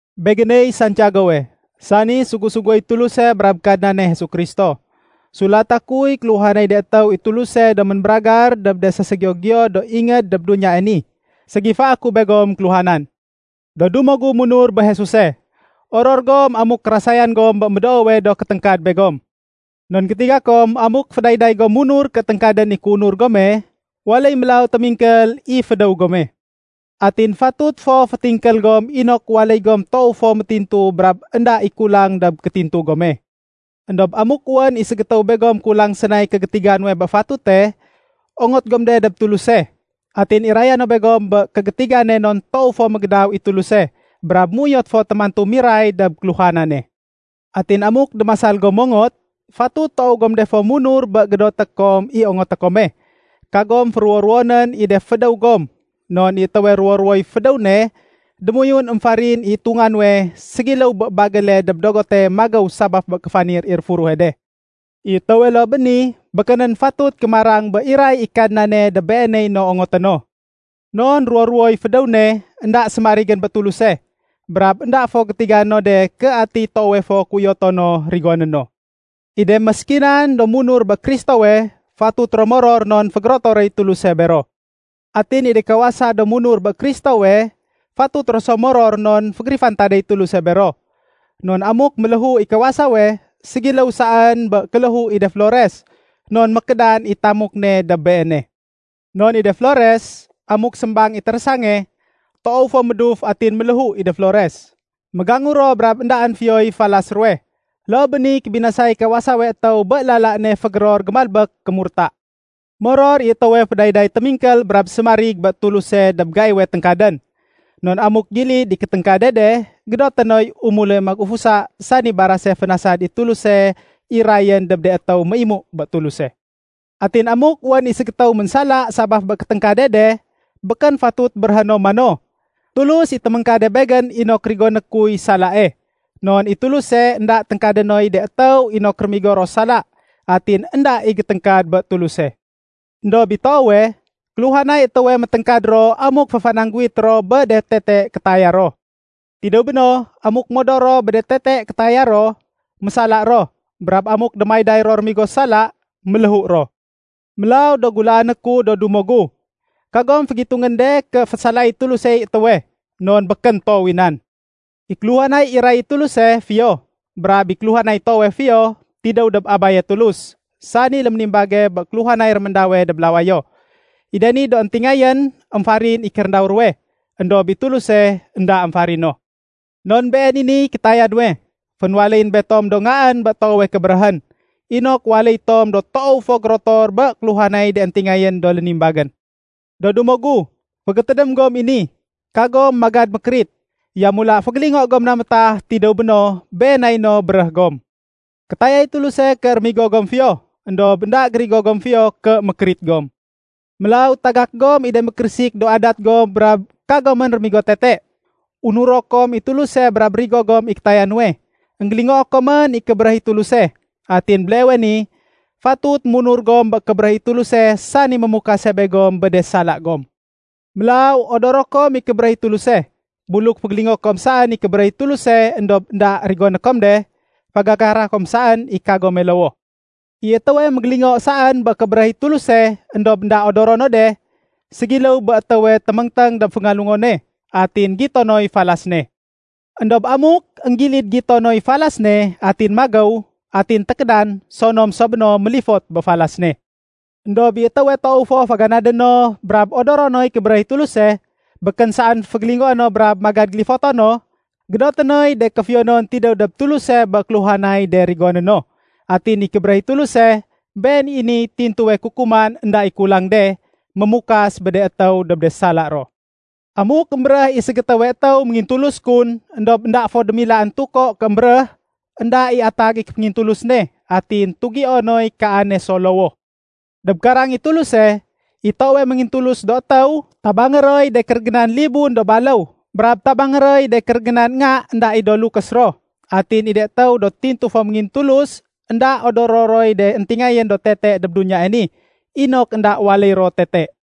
Begéney Santiagowe, sani sugu-suguéy Tuluse brab Kadnane Jesu Kristo. Sulata kuy kéluhanay de étéw i Tuluse do ménbéragar dob de séségiyo-giyo do ingéd dob duniyae ni. Ségifaé ku begom kéluhanan. Do dumo gu munur bé Jesuse, oror gom amuk kérasayan gom bé médoowe do kéténgkad begom. Non gétiga kom amuk fédayday gom munur ké téngkadén i kéunur gome, waléy mélaw témingkél i fédéw gome. Atin fatut fo fétingkél gom inok waléy gom toow fo métintu brab énda i kulang dob kétintu gome. Endob amuk wén i ségétéw begom kulang sénay kégétiga nuwe bé fatute, ongot gom de dob Tuluse. Atin iraya no begom bé kégétigane non toow fo mégédaw i Tuluse brab méuyot fo témantu miray dob kéluhanane. Atin amuk démasal gom mongot, fatut toow gom de fo munur bé gédoté kom i ongoté kome, kagom féruwo-ruwonén i de fédéw gom. Non i étéwe ruwo-ruwoy fédéw ne, démoyun émfarin i itunga nuwe, ségiléw bé bagéle dob dogote magéw sabaf bé kéfanir i réfuruhe de. I étéwe loo bé ni, békénén fatut kémarang bé iray i Kadnane dob beeney no ongoté no. Non ruwo-ruwoy fédéw ne, énda sémarigén bé Tuluse. Brab énda fo gétiga no de ké atiy toowe fo kéuyoto no rigoné no. I de méskinan do munur bé Kristowe, fatut ro moror non fégérotoréy Tuluse bero. Atin i de kawasa do munur bé Kristowe, fatut ro so moror non fégérifantadéy Tuluse bero. Non amuk méléhu i kawasawe, ségiléw saén bé kéléhu i de flores, non mékédan i tamuk ne dob beene. Non i de flores, amuk sémbang i térésange, toow fo méduf atin méléhu i de flores. Mégangu ro brab éndaén fiyoy falas ruwe. Loo bé niy kébinasay kawasawe étéw bé lala ne fégéror gémalbék kémurta. Moror i étéwe fédayday témingkél brab sémarig bé Tuluse dob gaiwe téngkadén. Non amuk gilid i kéténgkade de, gédoté noy umule magufusa sani barase fénasad i Tuluse irayén dob de étéw méimu bé Tuluse. Atin amuk wén i ségétéw ménsala sabaf bé kéténgkade de, békén fatut béréhé no mano, “Tulus i téméngkade begén inok rigoné kuy salae.” Non i Tuluse énda téngkadé noy de étéw inok rémigo ro sala, atin énda i géténgkad bé Tuluse. Endob i toowe, kéluhanay étéwe météngkad ro amuk féfanangguwit ro bé de tete kétaya ro. Tidéw béno, amuk modor ro bé de tete kétaya ro, mésala ro. Brab amuk démayday ro rémigo sala, méléhu ro. Mélaw do gulaané ku do dumo gu, kagom fégitungén de ké fésalaéy Tulusey étéwe, non békén toow i nan. I kéluhanay iray i Tuluse, fiyo. Brab i kéluhanay toowe fiyo, tidéw dob Abaye Tulus, sani léménimbage bé kéluhanay réméndawe dob lawayo. I de ni do éntingayén, émfarin i kéréndaw ruwe. Endob i Tuluse, énda émfarino. Non been i niy kétaya nuwe, fénwaléyén betom do ngaén bé toowe kébéréhén, inok waléy tom do toow fo gérotor bé kéluhanay de éntingayén do lénimbagén. Do dumo gu, fégétédém gom i ni, kagom magad mékérit. Yamula fégélingo gom na métah, tidéw béno, been nay no béréh gom. Kétayay Tuluse ké rémigo gom fiyo, éndob énda gérigo gom fiyo ké mékérit gom. Mélaw tagak gom i de mékérésik do adat gom brab kagomén rémigo tete. Unuro kom i Tuluse brab rigo gom i kétaya nuwe. Enggélingoo komén i kébéréh i Tuluse. Atin béleewe ni, fatut munur gom bé kébéréh i Tuluse sani mémukase begom bé de sala gom. Mélaw odoro kom i kébéréh i Tuluse. Buluk fégélingoé kom saén i kébéréh i Tuluse éndob énda rigoné kom de, fagakara kom saén i kagome lowoh. I étéwe mégélingo saén bé kébéréh i Tuluse éndob énda odoro no de, ségiléw bé étéwe téméngténg dob féngalungone, atin gito noy falas ne. Endob amuk énggilid gito noy falas ne atin magéw, atin tékédan, sonom so béno mélifot bé falas ne. Endob i étéwe toow fo féganadé no brab odoro noy kébéréh i Tuluse, békén saén fégélingoé no brab magad gélifoto no, gédoté noy de kéfiyonon tidéw dob Tuluse bé kéluhanay de rigoné no. Atin i kébéréh i Tuluse, been i niy tintuwe kukuman énda i kulang de, mémukas bé de étéw dob de sala ro. Amuk émbéréh i ségétéwe étéw méngintulus kun, éndob énda fo démilaén tuko ké émbéréh, énda i atag i kéféngintulus ne, atin tugio noy kaane so lowoh. Dob karang i Tuluse, i toowe méngintulus do étéw, tabangé roy de kérégénan libun do baléw, brab tabangé roy de kérégénan nga énda i do lukés ro. Atin i de étéw do tintu fo méngintulus énda odoro roy de éntingayén do tete dob duniyae ni, inok énda waléy ro tete.